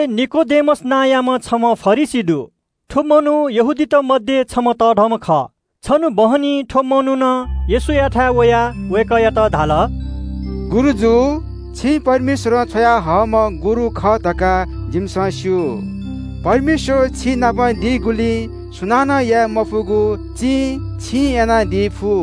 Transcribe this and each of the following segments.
निकोदेमस नांयाम्‍ह छम्‍ह फरिसी दु। व यहूदीतय् छम्‍ह तःधंम्‍ह थकालि खः। छन्‍हु चान्‍हय् व येशूयाथाय् वयाः धाल – “गुरुजु, छि परमेश्‍वरं छ्वयाहयादीम्‍ह गुरु खः धकाः जिमिसं स्‍यू। परमेश्‍वर छिनाप दीगुलिं सुनानं याये मफुगु चिं छिं यानादी फु।”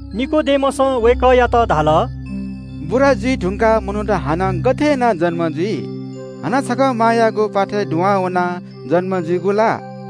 निकोदेमसं वय्‌कःयात धाल – “बुरा जुइ धुंकाः मनूत हानं गथे यानाः जन्‍म जुइ? हानं छकः मांयागु प्‍वाथय् दुहां वनाः जन्‍म जुइगु ला?”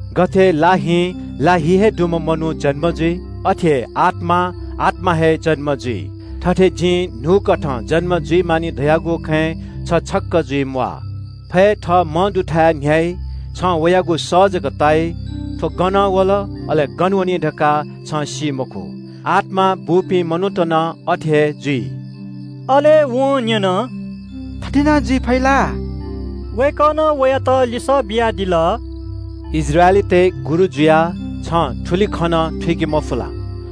गथे लाहिं ला हि हे दुम्‍ह मनू जन्‍म जुइ, अथे हे आत्‍मां आत्‍मा हे जन्‍म जुइ। थथे जिं न्‍हूकथं जन्‍म जुइ मानि धयागु खँय् छि छक्‍क जुइम्‍वाः। फय् थः मंदुथाय् न्‍ह्याइ, छिं उकियागु सः जक ताइ, व गनं वल, अले गन वनी धकाः छिं सी मखु। आत्‍मां बूपिं मनूत नं अथे हे जुइ।” अले वं न्‍यन – “थथे नं जुइ फइ ला?” वय्‌कलं लिसः बियादिल – “इस्राएलीतय् गुरु जुयाः छिं थुलि नं थुइके मफु ला?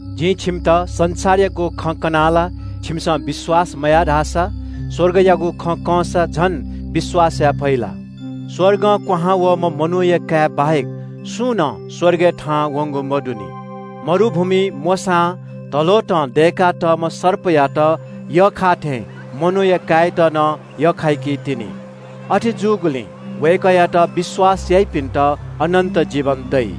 जिं छिकपिन्‍त संसारयागु खँ कनाः ला छिकपिन्‍सं विश्‍वास मयाः धाःसा स्‍वर्गयागु खँ कंसा झन गथे यानाः विश्‍वास यानादी? स्‍वर्गं क्‍वहां वःम्‍ह मनूया काय् बाहेक सुं नं स्‍वर्गय् थाहां वंगु मदुनि। मरुभूमिइ मोशां धलोतं दय्‌का तःम्‍ह सर्पयात यख्‍खाःथें मनूया काय्‌यात नं यख्‍खाइतिनि। अथे जूगुलिं वय्‌कःयात विश्‍वास याइपिन्‍त अनन्‍त जीवन दइ।”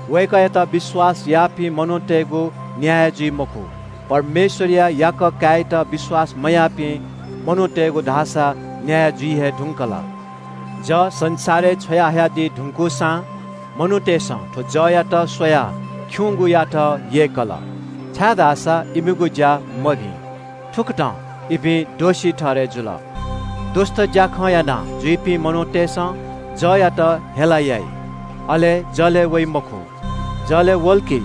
“वय्‌कःयात विश्‍वास याःपिं मनूतय्‌गु न्‍याय जुइ मखु, परमेश्‍वरया याकः काय्‌यात विश्‍वास मयाःपिं मनूतय्‌गु धाःसा न्‍याय जुइ हे धुंकल। जः संसारय् छ्वयाहयादी धुंकूसां मनूतय्‌सं थ्‍व जःयात स्‍वयाः खिउँयात यय्‌कल, छाय्‌धाःसा इमिगु ज्‍या मभिं। थुकथं इपिं दोषी ठहरय् जुल। दुष्‍ट ज्‍याखँ यानाजुइपिं मनूतय्‌सं जःयात हेला याइ, अले जलय् वइ मखु। जलय् वल कि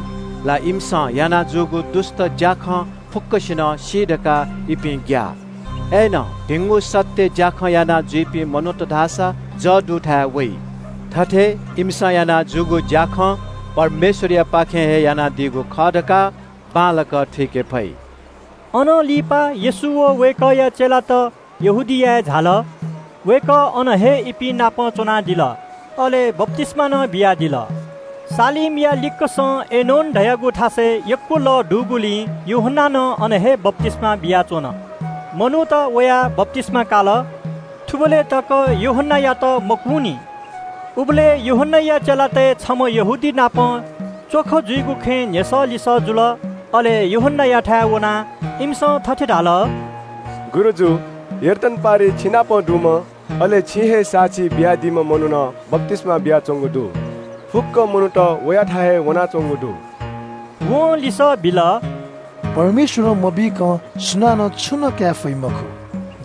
इमिसं याना जूगु दुष्‍ट ज्‍याखँ खने दइ धकाः इपिं ग्‍याः। अय्‌नं भिंगु सत्‍य ज्‍याखँ यानाजुइपिं मनूत धाःसा जः दुथाय् वइ। अले इमिसं याना जूगु ज्‍याखँ परमेश्‍वरयापाखें हे यानादीगु खः धकाः बांलाक थुइके फइ।” अनं लिपा येशू व वय्‌कःया चेलात यहूदियाय् झाल। वय्‌कः अन हे इपिं नाप च्‍वनादिल, अले बप्‍तिस्‍मा नं बियादिल। सालीमया लिक्‍कसं एनोन धाःगु थासय् यक्‍व लः दुगुलिं यूहन्‍नां नं अन हे बप्‍तिस्‍मा बियाच्‍वन। मनूत वयाः बप्‍तिस्‍मा काल। थुबलय् तक यूहन्‍नायात झ्‍यालखानाय् मतःनि। उबलय् यूहन्‍नाया चेलातय् छम्‍ह मनू नाप च्‍वख जुइगु खँय् जवाःसवाः जुल। अले यूहन्‍नायाथाय् वनाः इमिसं थथे धाल – “गुरुजु, यर्दन पारिइ छिनाप दुम्‍ह, अले छिं हे साक्षी बियादीम्‍ह मनुखं बप्‍तिस्‍मा बियाच्‍वंगु दु। फुक्‍क मनूत वयाथाय् हे वनाच्‍वंगु दु।” वं लिसः बिल – “परमेश्‍वरं मबीकं सुनानं छुं नं काये फइ मखु।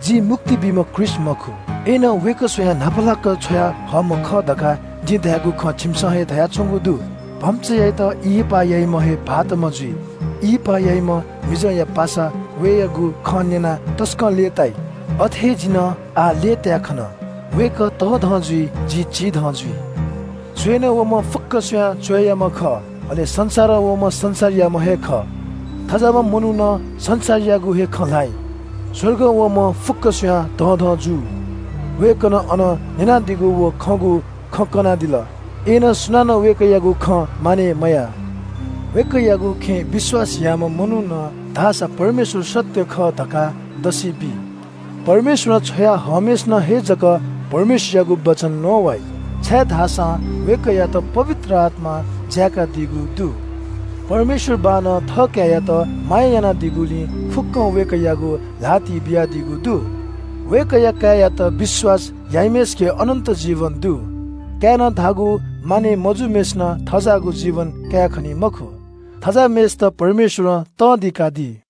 जि मुक्ति बीम्‍ह ख्रीष्‍ट मखु, अय्‌नं वय्‌कः स्‍वयाः न्‍हापालाक छ्वयाहःम्‍ह खः धकाः जिं धयागु खँ छिमिसं हे धयाच्‍वंगु दु। भम्‍चायात ब्‍याहा याःम्‍ह हे भाःतम्‍ह जुइ। ब्‍याहा याःम्‍ह मिजंया पासा वयागु खँ न्‍यनाः तसकं लय्‌ताइ। अथे हे जि नं आः लय्‌ताय् खन। वय्‌कः तःधं जुइ, जि चिधं जुइ।” “च्‍वय्‌नं वःम्‍ह फुक्‍क स्‍वयाः तःधंम्‍ह खः। अले संसारं वःम्‍ह संसारयाम्‍ह हे खः, थज्‍याःम्‍ह मनुखं संसारयागु हे खँ ल्‍हाइ। स्‍वर्गं वःम्‍ह फुक्‍क स्‍वयाः तःधं जू। वय्‌कलं थःम्‍हं न्‍यनादीगु व खंगु खँ हे कनादिल, अय्‌नं सुनानं वय्‌कःयागु खँ मानय् मयाः। वय्‌कःयागु खँय् विश्‍वास याःम्‍ह मनुखं धाःसा परमेश्‍वर सत्‍य खः धकाः दसि बी। परमेश्‍वरं छ्वया हःम्‍हय्‌सिनं हे जक परमेश्‍वरयागु वचन नवाइ, छाय्‌धाःसा वय्‌कःयात पवित्र आत्‍मां जाय्‌कादीगु दु। परमेश्‍वर बाःनं थःकाय्‌यात माया यानादीगुलिं फुक्‍कं वय्‌कःयागु ल्‍हातिइ बियादीगु दु। वय्‌कःया काय्‌यात विश्‍वास याइम्‍हय्‌सिके अनन्‍त जीवन दु। काय्‌नं धाःगु मानय् मजूम्‍हय्‌सिनं थज्‍याःगु जीवन कायेखनी मखु, थज्‍याःम्‍हय्‌सित परमेश्‍वरं तं दिकादी।”